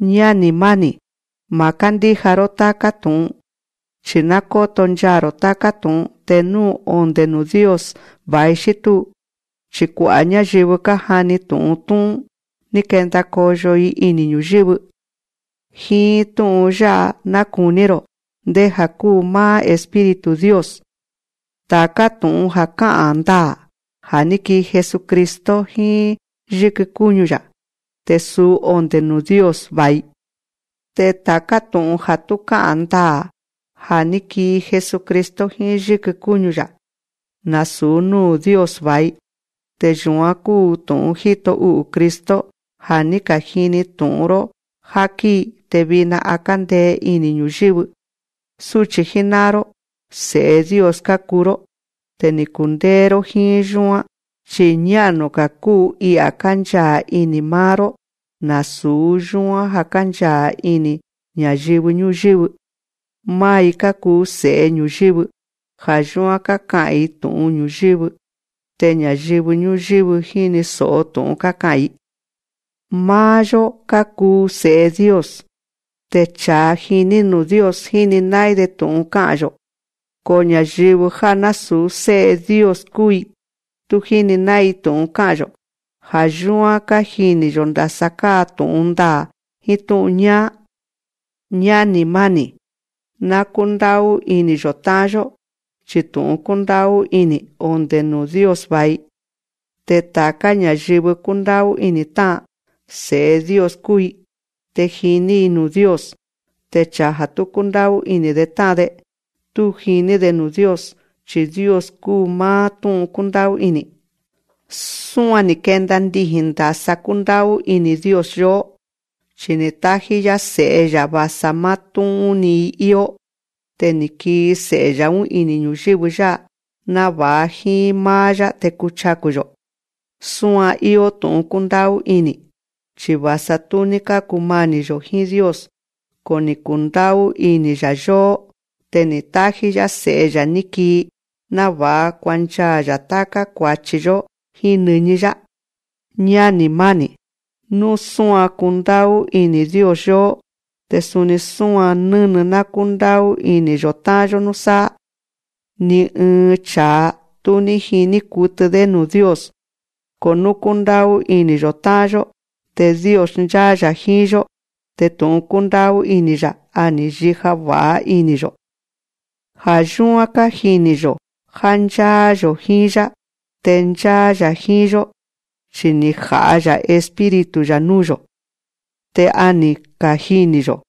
Ñáni̱ máni̱, ma̱ kándíja‑ró táká tu̱'un. Chi̱ ná kóto nchaa̱‑ro̱ táká tu̱'un te nú onde̱ nuu̱ Dios va̱i xí túu. Chi̱ kua'a̱ ñáyɨvɨ kájani tu̱'un tú'ún, ni̱ kenda koyo‑i ini̱ ñu̱yɨ́vɨ. Jíín tú'un yá'a ná kuní‑ro̱ ndéja̱ kúu máá Espíritu Dios: Ta̱ká tu̱'un ja̱ ká'a̱n ndaa̱ ja̱ ní kii Jesucristo jíín yíkɨ kúñu‑ya̱, te suu onde̱ nuu̱ Dios va̱i. Te ta̱ká tu̱'un ja̱ tú ká'a̱n ndaa̱ ja̱ ní kii Jesucristo jíín yíkɨ kúñu‑ya̱, nasu̱ núu̱ Dios va̱i. Te yu̱án kúu tu̱'un jíto u'u̱ Cristo, ja̱ ní ka̱jini tu̱'un‑ró já kíi, te vina a kándee ini̱ ñu̱yɨ́vɨ. Súchi̱ jíná'an‑ró, se̱'e Dios kákuu‑ró. Te ni̱ kundéé‑ró jíín yúán. Chi̱ ñá'nu‑ga̱ kúu I'a̱ kánchaa̱ ini̱ máá‑ró nasu̱ yúán já kánchaa̱ ini̱ ña̱yɨvɨ ñúyɨ́vɨ. Máá‑i kákuu se̱'e ñu̱yɨ́vɨ. Ja̱ yúán káka'a̱n‑i tu̱'un ñu̱yɨ́vɨ. Te ña̱yɨvɨ ñúyɨ́vɨ jíni so̱'o tu̱'un káka'a̱n‑i. Máá‑yó kákuu se̱'e Dios. Te cha̱a jiní nuu̱ Dios, jíni ná'ín‑de tu̱'un ká'a̱n‑yo̱. Ko ña̱yɨvɨ já násu̱ sé'e Dios kúu‑i, tú jíni ná'ín‑i tu̱'un ká'a̱n‑yo̱. Ja̱ yúán kájini̱‑yo̱ ndasa káa tu̱'un ndaa̱ jíín tú'un ñáá. Ñáni̱ máni̱, ná kúndá'ú ini̱‑yo̱ tá'an‑yó, chi tu̱'un kúndá'ú ini̱, onde̱ nuu̱ Dios va̱i. Te ta̱ká ña̱yɨvɨ kúndá'ú ini̱ tá'an, se̱'e Dios kúu‑i, te jiní‑i nuu̱ Dios. Te cha̱a ja̱ tú kúndá'ú ini̱‑de tá'an‑de, tú jiní‑de nuu̱ Dios, chi̱ Dios kúu máá tú'un kúndá'ú ini̱. Súan ni̱ kenda ndiji̱n ndasa kúndá'ú ini̱ Dios yóó. Chi ni̱ tájí‑yá Se̱'e‑ya̱, va̱sa máá tú'ún‑ni‑i íó. Te ni̱ kii Se̱'e‑ya̱‑ún ini̱ ñu̱yɨ́vɨ yá'a, náva̱'a jíín máá‑yá te kuchaku̱‑yo̱. Súan íó tu̱'un kúndá'ú ini̱, chi va̱sa tú ní kákumani̱‑yo̱ jíín Dios, ko ni̱ kundá'ú ini̱‑ya̱ yóó. Te ni̱ tájí‑yá Se̱'e‑ya̱ ní kii, náva̱'a kuanchaa̱‑ya̱ táká kua̱chi‑yó jíín nɨñí‑yá. Ñáni̱ máni̱, nú súan kúndá'ú ini̱ Dios yóó, te suni súan nɨ́nɨ ná kúndá'ú ini̱‑yo̱ tá'an‑yó núsáá. Ni ɨɨn cha̱a, tú ní jiní kutɨ‑dé nuu̱ Dios. Ko nú kúndá'ú ini̱‑yo̱ tá'an‑yó, te Dios ncháá‑ya̱ jíín‑yó, te tu̱'un kúndá'ú ini̱‑ya̱, a ni̱ yija va̱'a ini̱‑yo̱. Ja̱ yúán kájini̱‑yo̱ já ncháá‑yo̱ jíín‑yá. Te ncháá‑ya̱ jíín‑yó. Chi ni̱ ja̱'a‑ya̱ Espíritu‑ya̱ núu̱‑yo̱. Te a ni̱ kajini̱‑yo̱,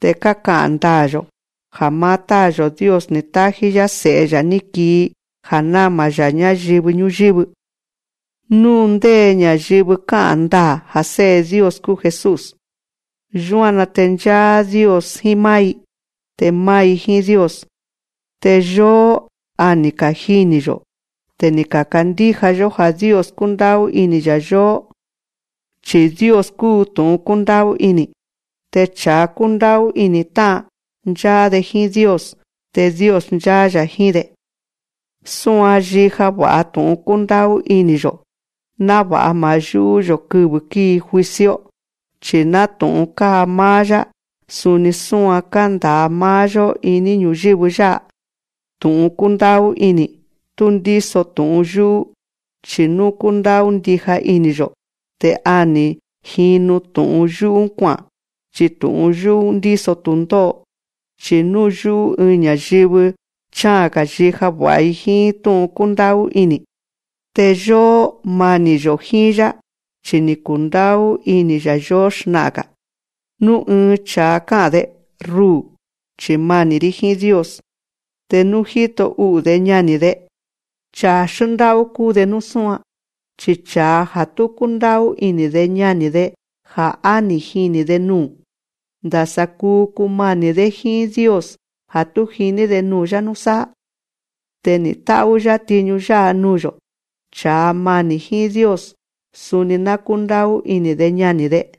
te káka'a̱n ndaa̱‑yo̱, já máá Táa̱‑yo̱ Dios ni̱ tájí‑yá Se̱'e‑ya̱ ní kii ja̱ náma‑ya̱ ñáyɨvɨ ñúyɨ́vɨ. Nú ndé ña̱yɨvɨ ká'a̱n ndaa̱ ja̱ Sé'e Dios kúu Jesús, yúan‑na te ncháá Dios jíín máá‑i, te máá‑i jíín Dios. Te yóó, a ni̱ kajini̱‑yo̱, te ni̱ ka̱kandíja‑yó já Dios kúndá'ú ini̱‑ya̱ yóó. Chi̱ Dios kúu tu̱'un kúndá'ú ini̱. Te cha̱a kúndá'ú ini̱ tá'an, ncháá‑de jíín Dios. Te Dios ncháá‑ya̱ jíín‑de. Súan yíja va̱'a tu̱'un kúndá'ú ini̱‑yo̱, náva̱'a ma̱ yú'ú‑yo̱ kɨvɨ́ kíi juicio, chi̱ nátu̱'un káa máá‑yá, suni súan kánda̱a máá‑yó iní ñu̱yɨ́vɨ yá'a. Tu̱'un kúndá'ú ini̱, tú ndíso tu̱'un yú'ú. Chi̱ nú kúndá'ú ndija ini̱‑yo̱, te a ni̱ jinu tu̱'un yú'ú kua'a̱n. Chi tu̱'un yú'ú ndíso tu̱ndó'o. Chi̱ nú yú'ú ɨɨn ña̱yɨvɨ, chá'a̱n‑ga̱ yija va̱'a‑i jíín tú'un kúndá'ú ini̱. Te yóó, mani̱‑yo̱ jíín‑yá, chi ni̱ kundá'ú ini̱‑ya̱ yóó xna'a̱n‑ga̱. Nú ɨɨn cha̱a ká'a̱n‑de: Ruu̱, chi̱ mani̱‑rí jíín Dios. Te nú jíto u'u̱‑de ñani̱‑de, chaa̱ xndá'ú kúu‑de nú súan. Chi cha̱a ja̱ tú kúndá'ú ini̱‑de ñani̱‑de ja̱ á ni̱ jini̱‑de nuu̱, ndasa kuu kumani̱‑dé jíín Dios ja̱ tú jiní‑de nuu̱‑yá núsáá. Te ni̱ tá'ú‑yá tiñu yá'a nuu̱‑yo̱: Cha̱a mani̱ jíín Dios, suni ná kúndá'ú ini̱‑de ñani̱‑de.